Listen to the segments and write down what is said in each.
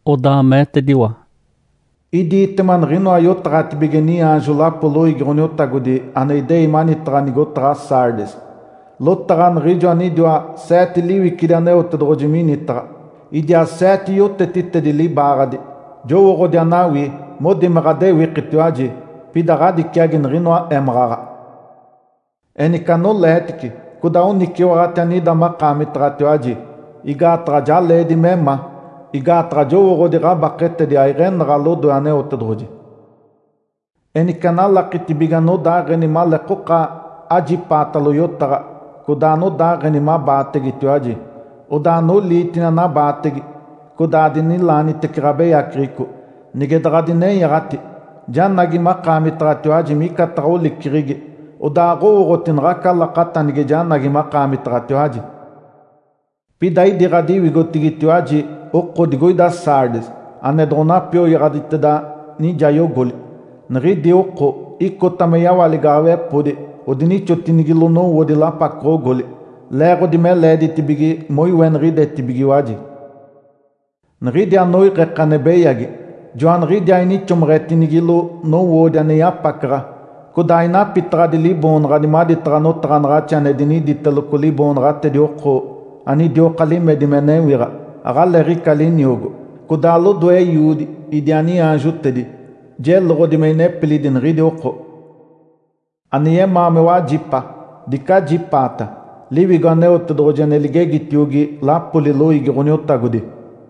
Odaa meetediwa, “Idiitema niɡ̶inoa yotaɡ̶atibige niaanjo lapo loiigi Ǥoniotagodi ane idei manitaɡ̶a nigotaɡ̶a Sardes: Lotaɡ̶a niɡ̶ijo anidiwa seete liwicidi Aneotedoɡ̶oji minitaɡ̶a, idiaa seete yotetitedi libaaɡ̶adi. Jowooɡ̶odi anawii. Modi me ɡ̶adewikitiwaji, pida ɡ̶adiciagi niɡ̶inoa émaɡ̶aɡ̶a. Enice anoleetice codaa oniciwaɡ̶ati anida makaamitaɡ̶atiwaji, igaataɡ̶a ja leedi me ma. Igaataɡ̶a jowooɡ̶odi ɡ̶abaketedi aiɡ̶enaɡ̶a lodoe Aneotedoɡ̶oji. Enice analakitibige anodaaɡ̶eni maleekoka ajipaatalo yotaɡ̶a codaa anodaageni mabaategetiwaji, odaa anoliitini anabaatege, codaa adinilaanitece ɡ̶abeyaceɡ̶eco. Nige daɡ̶adinenyaɡ̶ati, janagi makaamitaɡ̶atiwaji micataɡ̶a oliceɡ̶egi, odaa aɡ̶owooɡ̶oti naɡ̶aca lakata nige janagi makaamitaɡ̶atiwaji. Pida idi ɡ̶adiwigotigitiwaji oko digoida Sardes ane doɡ̶onapioyaɡ̶aditeda nijayogoli. Niɡ̶idi oko icota me yawaaligaɡ̶awepodi odinixotinigilo nowoodi lapacoɡ̶ogoli, leeɡ̶odi me leeditibige moiweniɡ̶idetibigiwaji. Niɡ̶idi anoiɡ̶eke ane beyagi, joaniɡ̶idiaa inixomeɡ̶etinigilo nowoodi ane yapacaɡ̶a, codaa ainapitaɡ̶adi liboonaɡ̶adi maditaɡ̶a notaɡ̶anaɡ̶axi ane diniditeloco liboonaɡ̶atedi oko anidioka limedi me newiɡ̶a, aɡ̶aleeɡ̶ica liniogo. Codaa lodoe Eiodi idiaa niaanjotedi, jeloɡ̶odi me inepilidi niɡ̶idi oko. Ane yemaa me wajipa, dice ajipaata Liwigo Aneotedoɡ̶oji ane ligegitiogi lapoli loiigi Ǥoniotagodi!”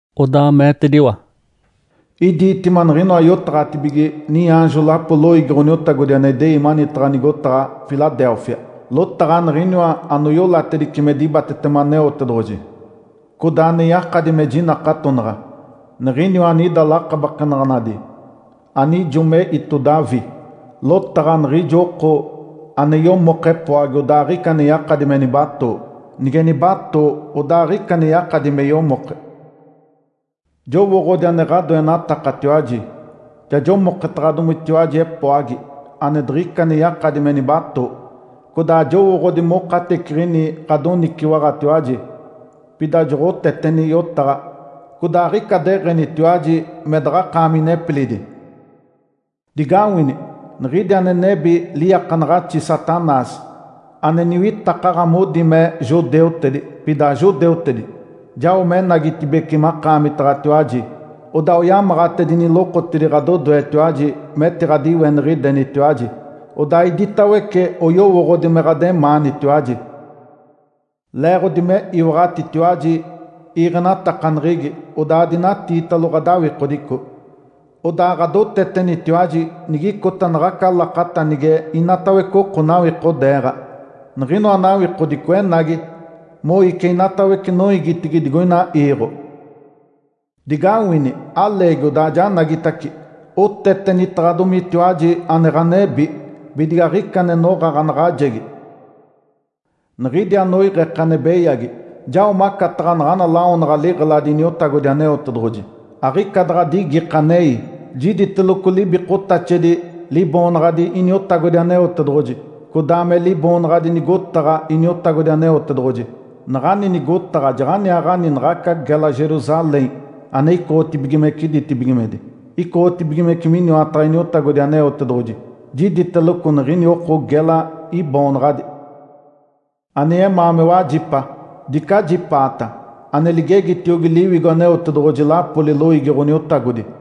Odaa meetediwa, “Idiitema niɡ̶inoa yotaɡ̶atibige niaanjo lapo loiigi Ǥoniotagodi ane idei manitaɡ̶a nigotaɡ̶a Filadélfia: Lotaɡ̶a Niɡ̶iniwa anoiolatedice me dibatetema Aneotedoɡ̶oji, codaa ane yakadi me jinakatonaɡ̶a, Niɡ̶iniwa anida lakabakenaɡ̶anaɡ̶adi anijo me íto Davi, lotaɡ̶a niɡ̶ijo oko ane yomoke epoagi odaa aɡ̶ica ane yakadi me nibatoo, nige nibatoo, odaa aɡ̶ica me yakadi me yomoke. Jowooɡ̶odi ane ɡ̶adoenatakatiwaji. Ja jomoketaɡ̶adomitiwaji epoagi ane diɡ̶ica ane yakadi me nibatoo. Codaa jowooɡ̶odi mokateciɡ̶ini ɡ̶adoniciwaɡ̶atiwaji, pida joɡ̶oteteni yotaɡ̶a, codaa aɡ̶ica deɡ̶enitiwaji me daɡ̶akaami inepilidi. Digawini! Niɡ̶idi ane nebi liiakanaɡ̶axi Satanás, ane niwitakaɡ̶a modi me judeutedi pida ajudeutedi, jao menagitibeci makaamitaɡ̶atiwaji, odaa oyamaɡ̶atedini lokotidi ɡ̶adodoetiwaji metiɡ̶adiweniɡ̶idenitiwaji. Odaa iditawece oyowooɡ̶odi me ɡ̶ademaanitiwaji. Leeɡ̶odi me iwaɡ̶atitiwaji iiɡ̶enatakaneɡ̶egi odaa adinatiitalo ɡ̶adawikodico, odaa ɡ̶adotetenitiwaji nigicota naɡ̶aca lakata nige inatawece oko nawikodeeɡ̶a, niɡ̶inoa nawikodico enagi moici inatawece noiigitigi digoina iiɡ̶o. Digawini! Aleegi odaa janagitace. Otetenitaɡ̶adomitiwaji ane ɡ̶anebi bidige aɡ̶ica ane noɡ̶a ɡ̶anaɡ̶ajegi. Niɡ̶idi anoiɡ̶eke ane beyagi, jao macataɡ̶a naɡ̶ana lawonaɡ̶a liɡ̶eladi Iniotagodi Aneotedoɡ̶oji, aɡ̶ica daɡ̶a digike anei. Jiditeloco libikotaxedi Liboonaɡ̶adi Iniotagodi Aneotedoɡ̶oji codaa me liboonaɡ̶adi nigotaɡ̶a Iniotagodi Aneotedoɡ̶oji. Naɡ̶ani nigotaɡ̶a jaɡ̶aniaaɡ̶ani naɡ̶aca gela Jerusalém ane icoɡ̶otibigimece ditibigimedi, icoɡ̶otibigimece miniwataɡ̶a Iniotagodi Aneotedoɡ̶oji. Jiditeloco niɡ̶ini oko gela iboonaɡ̶adi. Ane yemaa me wajipa, dice ajipaata ane ligegitiogi Liwigo Aneotedoɡ̶oji lapoli loiigi Ǥoniotagodi!”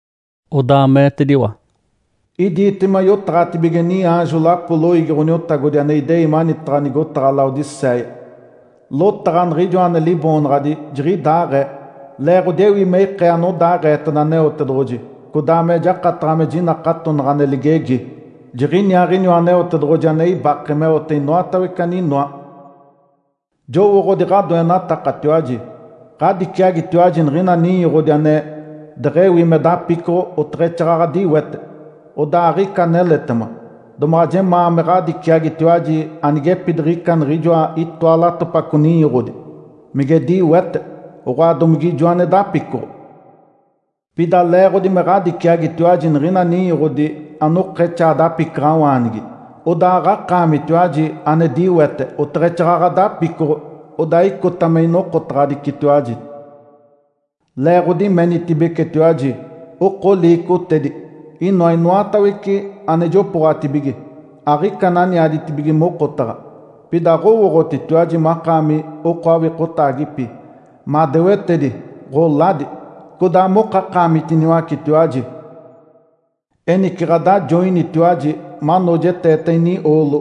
Odaa meetediwa, “Idiitema yotaɡ̶atibige niaanjo lapo loiigi Ǥoniotagodi ane idei manitaɡ̶a nigotaɡ̶a Laodicéia: Lotaɡ̶a Niɡ̶ijoa ane liboonaɡ̶adi ‘Jiɡ̶idaaɡ̶ee’, leeɡ̶odi ewi me ikee anodaaɡ̶eeteda Aneotedoɡ̶oji codaa me jakataɡ̶a me jinakatonaɡ̶a ane ligegi. Jiɡ̶iniaaɡ̶iniwa Aneotedoɡ̶oji ane ibake meote inoatawece aninoa. Jowooɡ̶odi ɡ̶adoenatakatiwaji. Ǥadiciagitiwaji niɡ̶ina ninyoɡ̶odi ane deɡ̶ewi me dapicoɡ̶o oteɡ̶exaaɡ̶aɡ̶a diwete, odaa aɡ̶ica aneletema. Domaɡ̶a jemaa me ɡ̶adiciagitiwaji anigepidiɡ̶ica niɡ̶ijoa itoa latopaco ninyoɡ̶odi, mige diwete, oɡ̶oa, domige ijo ane dapicoɡ̶o. Pida leeɡ̶odi me ɡ̶adiciagitiwaji niɡ̶ina ninyoɡ̶odi anokexaa dapicaɡ̶awaanigi, odaa aɡ̶akaamitiwaji ane diwete oteɡ̶exaaɡ̶aɡ̶a dapicoɡ̶o, odaa icota me inokotaɡ̶adicitiwaji. Leeɡ̶odi menitibecetiwaji, ‘Oko liicotedi, inoa inoatawece ane jopooɡ̶atibige, aɡ̶ica ane aniaditibige mokotaɡ̶a.’ Pida aɡ̶owooɡ̶otitiwaji makaami oko awikotaagipi, madewetedi, ɡ̶oladi, codaa mokakaamitiniwacetiwaji. Enice ɡ̶adajoinitiwaji manoojeteeta inioolo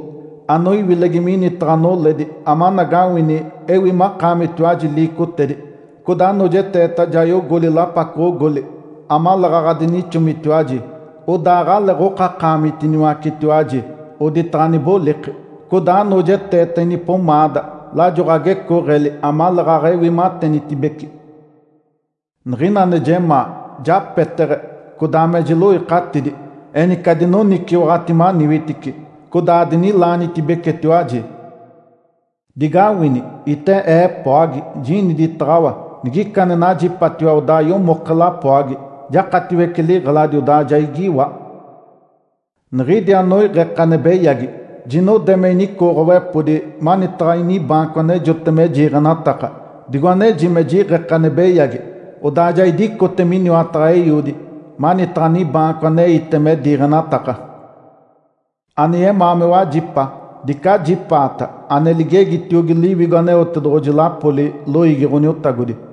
anoiwilegi minitaɡ̶a noledi amanagawini ewi makaamitiwaji liicotedi. Codaa anoojeteeta jayogoli lapacoɡ̶ogoli amaleeɡ̶aɡ̶a adinixomitiwaji, odaa aɡ̶aleeɡ̶okakaamitiniwacetiwaji oditaɡ̶a aniboliki. Codaa anoojeteeta inipomaada lajo ɡ̶agecooɡ̶eli amaleeɡ̶aɡ̶a ewi matenitibece. Niɡ̶ina ane jemaa, japeteɡ̶e codaa me jiloikatidi. Enice adinoniciwaɡ̶ati maniwitici, codaa adinilaanitibecetiwaji. Digawini! Ite Ee epoagi, jiniditaɡ̶awa. Nigica ane najipatiwa, odaa yomoke lapoagi, jakatiwece liɡ̶eladi, odaa ja igiiwa. Niɡ̶idi anoiɡ̶eke ane beyagi, jinode me inicooɡ̶owepodi manitaɡ̶a inibaanco anejote me jiiɡ̶enataka, digo aneji me jiɡ̶eke ane beyagi, odaa ja idicote miniwataɡ̶a Eiodi manitaɡ̶a nibaanco aneite me diiɡ̶enataka. Ane yemaa me wajipa, dice ajipaata ane ligegitiogi Liwigo Aneotedoɡ̶oji lapoli loiigi Ǥoniotagodi!”